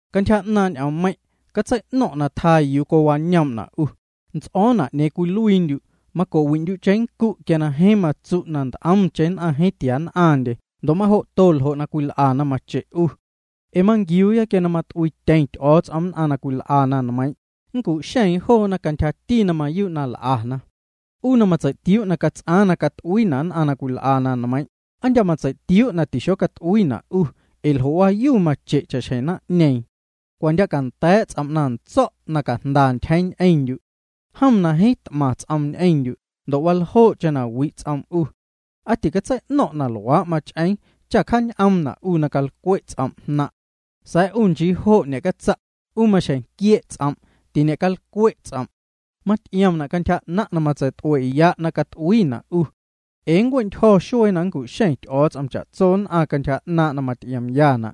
Cantyja 'naaⁿ' ñ'oommeiⁿ', catsei'no̱ⁿ' na tjaa'naⁿ yuu cowañoom'na' 'u, nts'o̱o̱na' 'ñeeⁿ cwiluiindyu', maco'wi'ndyu' cheⁿnncu' quia na jeeⁿ matsu' na nt'omcheⁿ nn'aⁿ jeeⁿ tiann'aⁿndye ndo' majo'to ljo' na cwil'ana mache' 'u. Ee manquiuyaaya quia na nt'uiityeⁿ Ty'o̱o̱ts'om nn'aⁿ na cwil'a na nmeiiⁿ', nncu'xeeⁿ joona cantyjati na mayuu' na l'ana. 'U na matseitiuu' na cats'aaⁿ na cat'uiina' nn'aⁿ na cwil'a na nmeiiⁿ', ¿aa ndya' matseitiuu' na tixocat'uiina' 'u ndo' ljo'waayu mache' cha'xjeⁿ naⁿ'ñeeⁿ? Cwa ndya' canda̱a̱' ts'om' na ntso̱' na cajnda ntyjeeⁿ ñ'eⁿndyu'. Jom na jeeⁿ t'maⁿ ts'oom ñ'eⁿndyu', ndo' waljoo'cheⁿ na wi' ts'oom 'u. ¿Aa ticatsei'no̱ⁿ' na luaa' mach'eeⁿ cha cjaañ'oomna' 'u na calcwe' ts'om' jnaⁿ'? Sa̱a̱ 'u nchii jo' ñe'catsa', 'u maxjeⁿ quie' ts'om', tiñe'calcwe' ts'om'. Maty'iomna' cantyja 'naⁿ' na matseit'ue'ya' na cat'uiina' 'u. Ee nncue'ntyjo̱ xuee na nncu'xeⁿ Ty'o̱o̱ts'om cha'tso nn'aⁿ cantyja 'naaⁿ' na maty'iomyana'.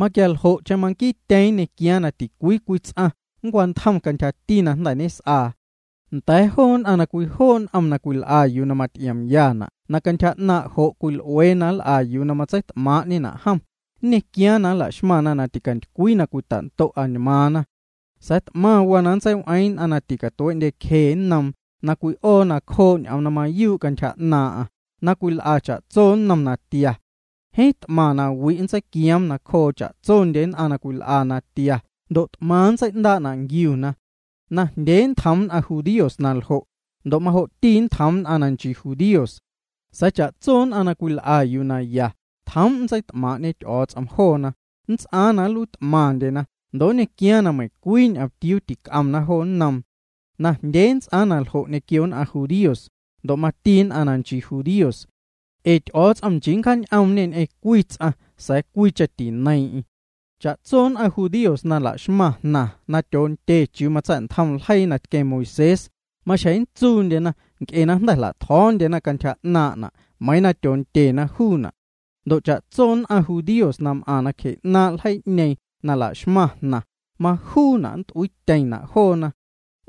Maquialjo'cheⁿ manquiityeeⁿ nñequiaaⁿ na ticwii cwii ts'aⁿ nncwantjom cantyjati na jnda̱ ñes'aa. Nda̱a̱ joo nn'aⁿ na cwijoo' n'om na cwil'a yuu na maty'iomyana' na cantyja 'naaⁿ' jo' cwil'uee na nl'a yuu na matseit'maa'ñena' jom, nñequiaaⁿ na nla'xmaⁿna na ticantycwii na cwita'ndo' añmaaⁿna. Sa̱a̱ t'maⁿ waa na nntseiw'eeⁿ nn'aⁿ na ticatuee'ndyecje nnoom, na cwi'oo nacjoo' ñ'oom na mayuu' cantyja 'naaⁿ'aⁿ, na cwil'a cha'tso nnom natia. Jeeⁿ t'maⁿ nawi' nntseiquioom nacjoo cha'tsondye nn'aⁿ na cwil'a natia ndo' t'maⁿ nntsei'ndaa'na' nquiuna. Najndyee nntjoom nn'aⁿ judíos na ljo', ndo' majo'ti nntjoom nn'aⁿ na nchii judíos. Sa̱a̱ cha'tso nn'aⁿ na cwil'a yuu na ya, tjoom' nntseit'maaⁿ'ñe Ty'o̱o̱ts'om joona, nnts'aaⁿ na nluiit'maⁿndyena ndo' nñequiaaⁿ na meiⁿcwii ñomtiuu tic'omna jo nnoom. Najndyee nnts'aaⁿ na ljo' ñequio nn'aⁿ judíos, ndo' mati nn'aⁿ na nchii judíos. Ee Ty'o̱o̱ts'om nchii na nncjaañ'oom'ñê ñ'eⁿ cwii ts'aⁿ, sa̱a̱ cwiicheⁿ tineiiⁿ'eⁿ. Cha'tso nn'aⁿ na nchii judíos na la'xmaⁿ jnaⁿ na tyoondye chiuu matsa̱'ntjom ljeii na tqueⁿ Moisés, maxjeⁿ nntsuundyena nc'e na jnda̱ jla'tjo̱o̱ndyena cantyja 'naaⁿ'na' meiiⁿ tyoondyena juuna'. Ndo' cha'tso nn'aⁿ judíos na m'aⁿ nacje 'naaⁿ' ljeii'ñeeⁿ na la'xmaⁿ jnaⁿ, majuuna' nnt'uiityeⁿna' joona.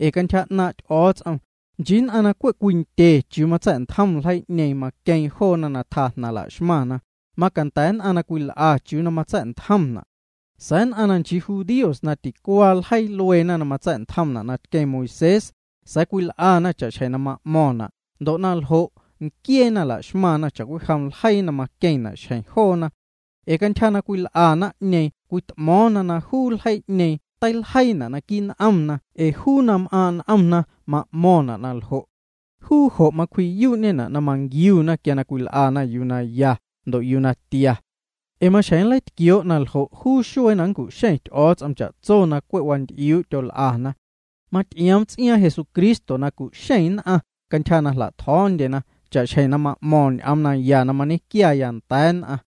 Ee cantyja 'naaⁿ' Ty'o̱o̱ts'om, nchii nn'aⁿ na cwe' cwindye chiuu matsa̱'ntjom ljeii'ñeeⁿ maqueeⁿ joona na tjaa jnaⁿ la'xmaⁿna, macanda̱ nn'aⁿ na cwil'a chiuu na matsa̱'ntjomna'. Sa̱a̱ nn'aⁿ na nchii judíos na ticuaa ljeii lueena na matsa̱'ntjomna' na tqueⁿ Moisés, sa̱a̱ cwil'ana cha'xjeⁿ na ma'mo̱ⁿna' ndo' na ljo' nquieena laxmaⁿna' cha'cwijom ljeii na maqueⁿna' xjeⁿ joona. Ee cantyja na cwil'a naⁿ'ñeeⁿ cwit'mo̱o̱ⁿna na juu ljeii'ñeeⁿ teiljeiina' naquii' n'omna ee juu na m'aaⁿ' n'omna ma'mo̱ⁿna' na ljo'. Juu jo' macwji'yuu'ñena' na manquiuna quia cwil'ana yuu na ya, ndo' yuu na tia. Ee maxjeⁿ nleitquioo' na ljo' juu xuee na nncu'xeⁿ Ty'o̱o̱ts'om cha'tso na cwe' wanty'iuu' tyol'ana. Maty'ioom ts'iaaⁿ Jesucristo na cu'xeeⁿ nn'aⁿ cantyja na jla'tjo̱o̱ndyena cha'xjeⁿ ma'mo̱ⁿ ñ'oom naya na mañequiaya nda̱a̱ nn'aⁿ.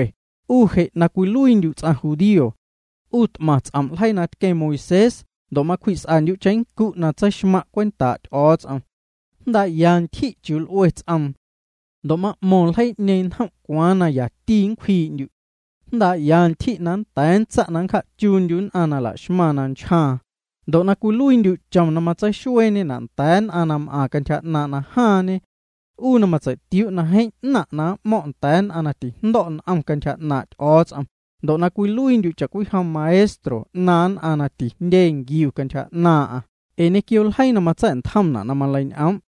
'U je' na cwiluiindyu' ts'aⁿ judío. 'U quit'maⁿ ts'om' ljeii na tqueⁿ Moisés, ndo' macwji's'andyu' cheⁿnncu' na tseixmaⁿ' cwentaa' Ty'o̱o̱ts'om. Jndaa'ya ntyji' chiuu l'ue ts'oom. Ndo' ma'mo̱ⁿ ljeii'ñeeⁿ njom' cwaaⁿ na yati nncwjii'ndyu'. Jndaa'ya ntyji' na nnda̱a̱ nntsa' na nncja'chuundyu' nn'aⁿ na laxmaⁿ na nchjaaⁿ, ndo' na cwiluiindyu' chom na matseixueeñena' nda̱a̱ nn'aⁿ na m'aⁿ cantyja 'naaⁿ' na jaaⁿñe. 'U matseitiuu' na jeeⁿ 'naⁿ' na m'mo̱ⁿ' nda̱a̱ nn'aⁿ na tijndo̱' n'om cantyja 'naaⁿ' Ty'o̱o̱ts'om ndo' na cwiluiindyu' cha'cwijom maestro 'naaⁿ nn'aⁿ na tijndye nquiu cantyja 'naaⁿ'aⁿ ee ñequio ljeii na matsa̱'ntjomna' na maleiñ'oom',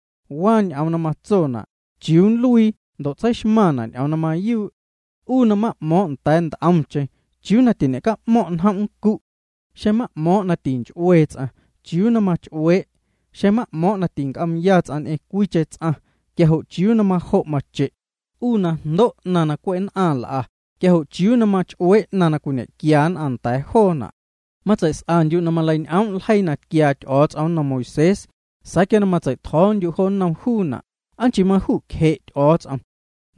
waa ñ'oom na matsona' chiuu na nluii ndo' tseixmaⁿna' ñ'oom na mayuu'. 'U na ma'mo̱o̱ⁿ' nda̱a̱ nt'omcheⁿ, ¿chiuu na tiñe'ca'mo̱ⁿ' njom' nncu'? Xeⁿ ma'mo̱o̱ⁿ' na tinch'uee ts'aⁿ, ¿chiuu na mach'uee'? Xeⁿ ma'mo̱o̱ⁿ' na tinc'oomya ts'aⁿ ñ'eⁿ cwiicheⁿ ts'aⁿ, quia jo' ¿chiuu na majo' mache'? 'U na jndo' 'naⁿ na cwe' nn'aⁿ l'a, quia jo' ¿chiuu na mach'uee' 'naⁿ na cwiñequia nn'aⁿ nda̱a̱ joona'? Matseis'andyu' na maleiñ'oom' ljeii na tquiaa Ty'o̱o̱ts'om nnom Moisés, sa̱a̱ quia matsei'tjo̱o̱ndyu' jo nnom juuna', ¿aa nchii maju'cje' Ty'o̱o̱ts'om?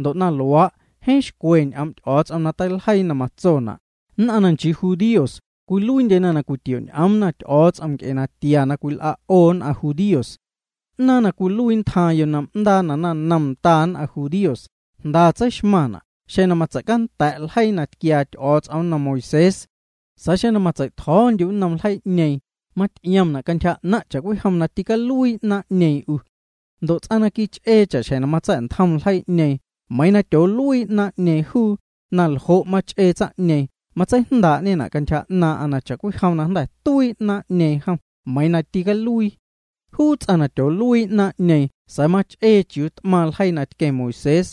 Ndo' na luaa', jeeⁿ xcwe ñ'oom' Ty'o̱o̱ts'om na teiljeii na matsona': “Nn'aⁿ na nchii judíos cwiluiindyena cwitio'ñ'oomna Ty'o̱o̱ts'om nc'e natia na cwil'a' 'o nn'aⁿ judíos.” 'Naaⁿ na cwiluii ntjaaⁿ yo'ndaa naⁿnom nda nn'aⁿ judíos jnda tseixmaⁿna' xeⁿ matseicanda̱' ljeii na tquiaa Ty'o̱o̱ts'om nnom Moisés. Sa̱a̱ xeⁿ matsei'tjo̱o̱ndyu' nnom ljeii'ñeeⁿ maty'iomna' cantyja 'naⁿ' cha'cwijom na tîcaluii 'naaⁿ'ñeeⁿ 'u. Ndo' ts'aⁿ na quich'ee cha'xjeⁿ matsa̱'ntjom ljeii'ñeeⁿ meiiⁿ tyooluii 'naaⁿ'ñeeⁿ juu, naljo' mach'ee tsaⁿ'ñeeⁿ matseijndaa'ñena' cantyja 'naaⁿ'aⁿ na cha'cwijom jnda̱ tuii 'naaⁿ'ñeeⁿ juu meiiⁿ tîcaluii. Juu ts'aⁿ na tyooluii 'naaⁿ'ñeeⁿ, sa̱a̱ mach'ee chiuu t'maⁿ ljeii na tqueⁿ Moisés,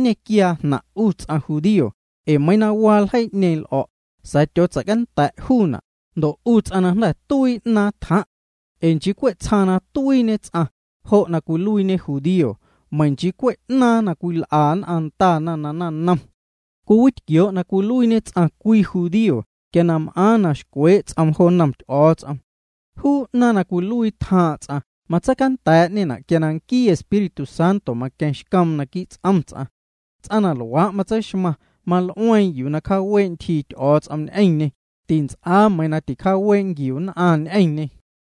nñequiaa jnaⁿ' 'u ts'aⁿ judío ee meiiⁿ na waa ljeii'ñeeⁿ l'o̱', sa̱a̱ tyootseicanda̱' juuna' ndo' 'u ts'aⁿ na jnda̱ tuii 'naaⁿ tjaaⁿ'. Ee nchii cwe' tsjaaⁿ na tuiiñe ts'aⁿ, jo' na cwiluiiñe judío, meiiⁿ nchii cwe' 'naaⁿ na cwil'ana ndana na naⁿnom. Cwiwitquioo' na cwiluiiñe ts'aⁿ cwii judío quia na m'aaⁿ na xcwee' ts'om jo nnom Ty'o̱o̱ts'om. Juu 'naaⁿ na cwiluii tjaaⁿ' ts'aⁿ matseicanda̱a̱'ñena' quia nquii Espíritu Santo maqueⁿ xcoom naquii' ts'om ts'aⁿ. Ts'aⁿ na luaa' matseixmaⁿ, mal'ueeⁿ yuu na nncjaawee' ntyjii Ty'o̱o̱ts'om ñ'eⁿñê, tints'aa meiiⁿ nn'aⁿ ticjaawee' nquiuna ñ'eⁿñê.